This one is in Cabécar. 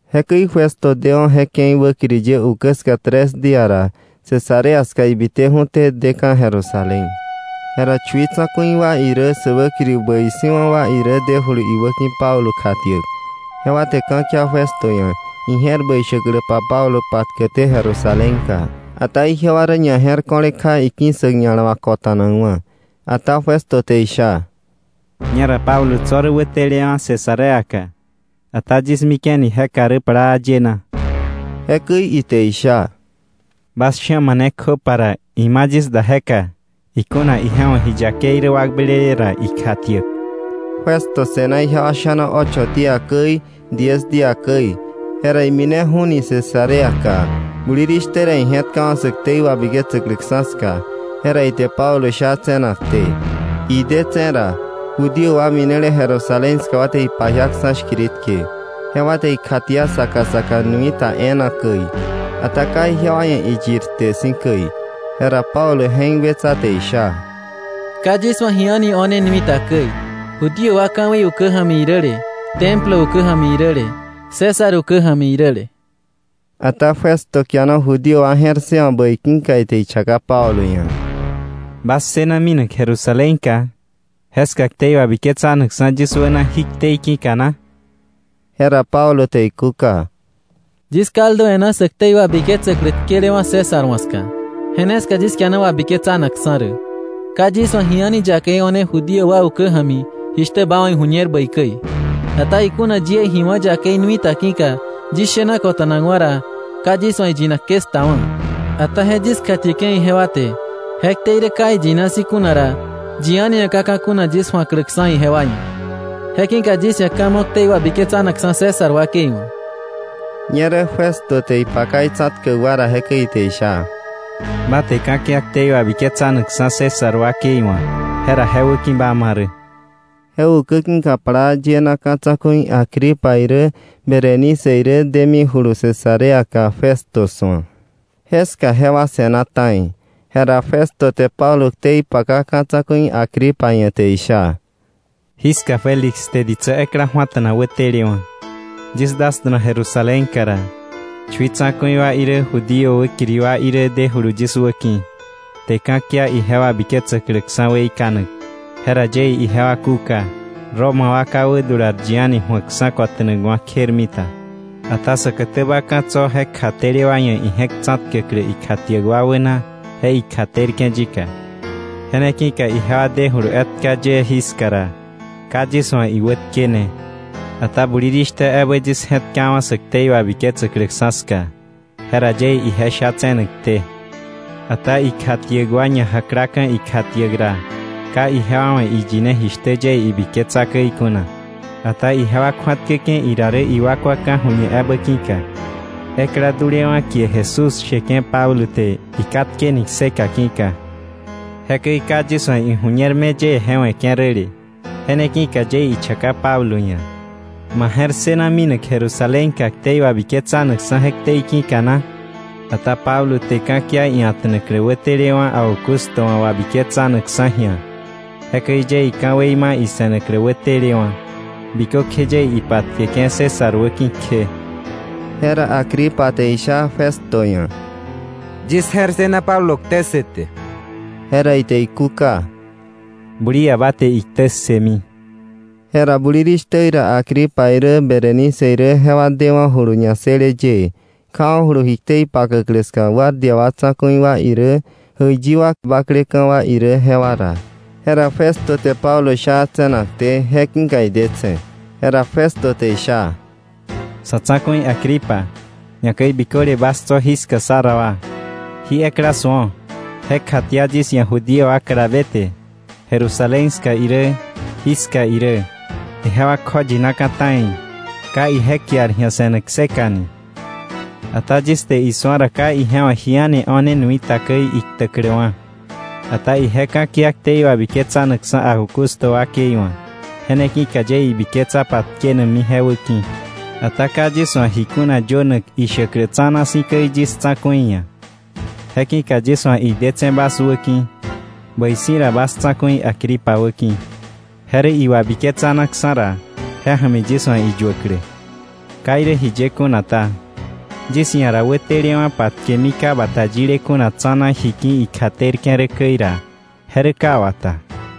Jekäi Festo dewa̱ je ke̱i wäkiri ye ukä ska tres día ra Cesarea ska ibiteju̱té deka̱ Jerusalén. Jera chui tsa̱ku̱i wa irä sä wäkiri bäi si̱wa̱ wa irä dejulu iwäki̱ Pablo kjatiäk. Jewa te ka̱kia Festo ia̱, ije̱r bäi shäkläpa Pablo patkäkté Jerusalénka. Ata ijewa rä ñaje̱rko̱le kja iki̱ssäk ña̱la wà ko̱ta̱nakwa̱. Ata Festo te isha: —Ñera Pablo tso̱ rä wätelewa̱ Cesareaka. Ata yis mike̱ni jeka rä plaa yena. Jekäi ite isha: —Bas sha̱ mane kjöpa ra ima yis da jeka, ikuna ije wa̱ ji yakei rä wakblele ra, ikjatiäk. Festo se̱na ijewa sha̱na ocho día käi, diez día käi, jera imineju̱ni Cesareaka. Bulirishtä ra ije̱tkawa̱ sä ktei wabiketsäkläksa̱ ska, jera ite Pablo sha tse̱nakté. Idetse̱ ra, Judío wa minele Jerusalén ska wa te ipajiaksa̱ shkiritke, jewa te ikjatia saka saka nui ta e̱e̱na käi. Ata ka ijewa ia̱ iyir kte si̱ käi. Jera Pablo je̱k wetsa te isha: —Ka yis wa̱ ji a̱ni o̱ne nui ta käi, Judío wa ka̱wei ukä ja̱mi iräle, Templo ukä ja̱mi iräle, César ukä ja̱mi iräle. Ata Festo kiana Judío wa je̱r ssëwa̱k bäi ki̱ka ite ichaka Pablo ia̱: —¿Ba ssëna minak Jerusalénka, jeska ktei wabiketsanakksa̱ yis wäna jí ktei ki̱ka na? Jera Pablo te ikúka: —Yis kaldu e̱ná sä ktei wabiketsäklä tkelewa̱ César wa̱ ska. Je ne ska yis kiana wabiketsanakksa̱ rä. Ka yis wa̱ ji a̱ni yakei o̱ne Judío wa ukä ja̱mi, jishtä ba wa̱ iju̱ñer bäi käi. Ata ikuna yie ji wá̱ yakei nui ta ki̱ka yis shena kota̱nakwa̱ ra, ka yis wa̱ iyinak ke 'sktawa̱. Ata je yis kjatieke̱ ijewa te je ktei rä ka iyina si̱ kuna ra, yi a̱ni ia̱ ka ka̱ kuna yis ju̱akläksa̱ ijewa ia̱. Je ki̱ka yis ia̱ ka̱ mo̱ ktei wabiketsanakksa̱ César wakei wa̱. Ñerä Festo te ipaka itsa̱tkäk wa ra, jekäi ite isha: —Ba te ka̱kia ktei wabiketsanakksa̱ César wakei wa̱, jera je wäki̱ ba ma rä. Je ukä ki̱ka plaa yena ka̱ tsa̱ku̱i Agripa irä Berenice irä demijulu Cesareaka Festo su̱ak. Jeska jewa se̱na ta̱i. Jera Festo te Pablo ktei paka ka̱ tsa̱ku̱i Agripa ia̱ te isha: —Jiska Félix te ditsä ekla ju̱ata̱na wätelewa̱. Yis dasta̱na Jerusalénka ra, chui tsa̱ku̱i wa irä, Judío wäkiri wa irä dejulu yis wäki̱, te ka̱kia ije wabiketsäkläksa̱ weikanak. Jera yie ijewa kúka, Roma wa ka wädular yi a̱ni ju̱akksa̱ kota̱nakwa̱ kjermita, ata säkätäba ka̱ tso̱ je kjatele wa ia̱ ije̱k tsa̱tkäklä ikjatiäk wa wäna je ikjaterke̱ yika. Je ne ki̱ka ijewa dejulu etka ye jiska ra, ka yis wa̱ iwätkene, ata bulirishtä ebä yis je̱tkawa̱ sä ktei wabiketsäkläksa̱ ska. Jera yie ije sha tse̱nakté. Ata ikjatiäk wa ñajaklaka̱ ikjatiäk ra, ka ijewa wa̱ iyine jishtä yie ibiketsa käi kuna. Ata ijewa kju̱atkäke̱ ira rä iwakwa ka̱ju̱ñe ebä ki̱ka, ekla dulewa̱ kie Jesús sheke̱ Pablo te ikatkeni kseka ki̱ka. Jekäi ka yis wa̱ iju̱ñer me yie je we̱ke̱ räle. Je ne ki̱ka yie ichaka Pablo ia̱: ‘¿Ma je̱r ssëna minak Jerusalénka ktei wabiketsanakksa̱ je ktei ki̱ka na?’ Ata Pablo te ka̱kia ia̱ta̱naklä wätelewa̱ Augusto wa̱ wabiketsanakksa̱ ji̱a. Jekäi yie ka̱wei ma ise̱naklä wätelewa̱, bikökje yie ipatkeke̱ César wäki̱ kje. Jera Agripa te isha Festo ia̱: —Yis je̱r ssëna Pablo ktä ssëte. Jera ite ikúka: —Bulia ba te iktä ssëmi. Jera bulishtä ra Agripa irä Berenice irä jewa dewa̱julu ñassële yëë, kjawa̱julu ji ktei pakäklä ska guardia wa tsa̱ku̱i wa irä, jäiyi wa bakleka̱ wa irä, jewa ra. Jera Festo te Pablo sha tse̱nakté, je ki̱ idetse̱. Jera Festo te isha: —Sa̱tsa̱ku̱i Agripa, ñakäi biköle bas tso̱ jiska sá ra wa; jí ekla su̱o, je kjatia yis ia̱ Judío wa kalabe te, Jerusalén ska irä, jiska irä. Ijewa kjoyinaka̱ ta̱i, ka ije kiar ji̱a se̱nak kseka ni. Ata yis te isu̱a ra, ka ije wa̱ ji a̱ni o̱ne nui ta käi iktäkläwa̱, ata ije ka̱kia ktei wabiketsanakksa̱ Augusto wakei wa̱. Je ne ki̱ yie ibiketsa patkenakmi je wäki̱. Ata ka yis wa̱ ji kuna yönak ishäklä tsa̱na si̱ käi yis tsa̱ku̱i ia̱. Je ki̱ka yis wa̱ idetse̱ bas wäki̱, bäi si̱ ra ba sa̱ tsa̱ku̱i Agripa wäki̱, je rä iwabiketsanaksa̱ ra, je ja̱mi yis wa̱ iyuäklä. Ka irä jiye kuna ta, yis ia̱ ra wätelewa̱ patkemi ka bata yile kuna tsa̱na ji ki̱ ikjatena rä käi ra, je rä ka wata.